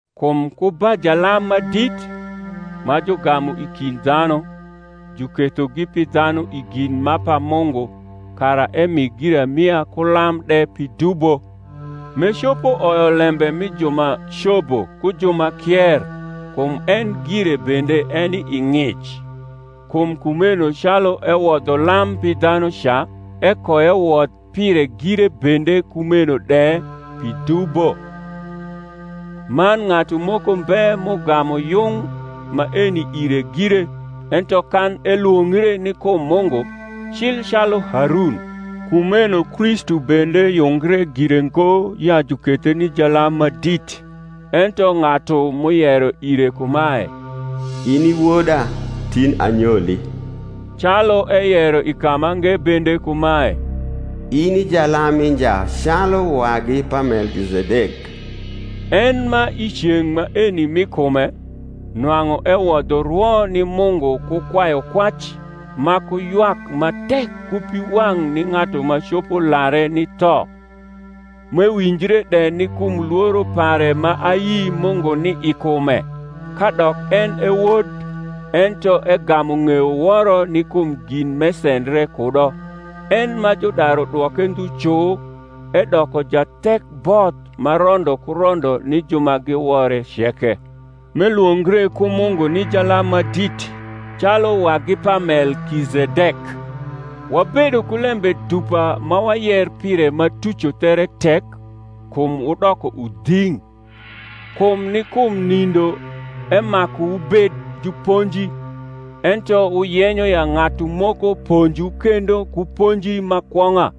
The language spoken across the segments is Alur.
Kum ku ba jalam ma dit, ma jugamu i kind dhanu, jukethogi pi dhanu i gin ma pa Mungu, kara emi giramia ku lam de pi dubo: m’ecopo oyo lembe mi ju ma cobo ku ju ma kier, kum en gire bende eni i ng’ic; kum kumeno calu ewodho lam pi dhanu ca, ekoewodh pire gire bende kumeno de, pi dubo. Man ng’atu moko mbe m’ugamu yung maeni ire gire, ento kan elwongre ni kum Mungu, cil calu Harun. Kumeno Kristu bende yungre gire ngo ya jukethe ni jalam ma dit, ento ng’atu m’uyero ire kumae, In i Woda; Tin anyoli: calu eyero i kamange bende kumae, In i jalam mi nja Calu wagi pa Melkizedek. En ma i ceng’ maeni mi kume, nwang’u ewodho rwo ni Mungu ku kwayukwac ma ku ywak ma tek ku piwang’ ni ng’atu ma copo lare ni tho, m’ewinjre de ni kum lworo pare ma ayi Mungu ni i kume, kadok en e Wod, ento egamu ng’eyo woro ni kum gin m’esendre kudo; en ma judaru dwoke ndhu cu, edoko jathekboth ma rondo ku rondo ni ju ma giwore ceke; m’elwongre ku Mungu ni jalam ma dit calu wagi pa Melkizedek. Wabedo ku lembe dupa ma wayer pire ma tuco there tek, kum wudoko udhing’. Kum ni kum nindo emaku wubed juponji, ento wuyenyo ya ng’atu moko ponjwu kendo ku ponji ma kwong’a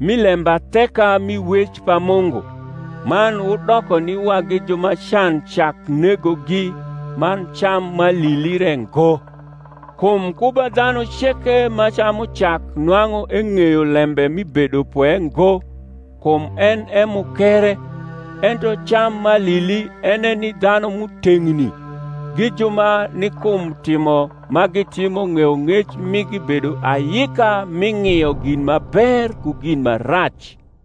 mi lembatheka mi wec pa Mungu; man wudoko ni wagi ju ma can cak negogi, man cam m’alili re ngo. Kum ku ba dhanu ceke ma camu cak nwang’u eng’eyo lembe mi bedopwe ngo; kum en e mukere. Ento cam m’alili en e ni dhanu m’uteng’ni, gi ju ma ni kum timo ma gitimo ng’eyong’ec migi bedo ayika mi ng’io gin ma ber ku gin ma rac.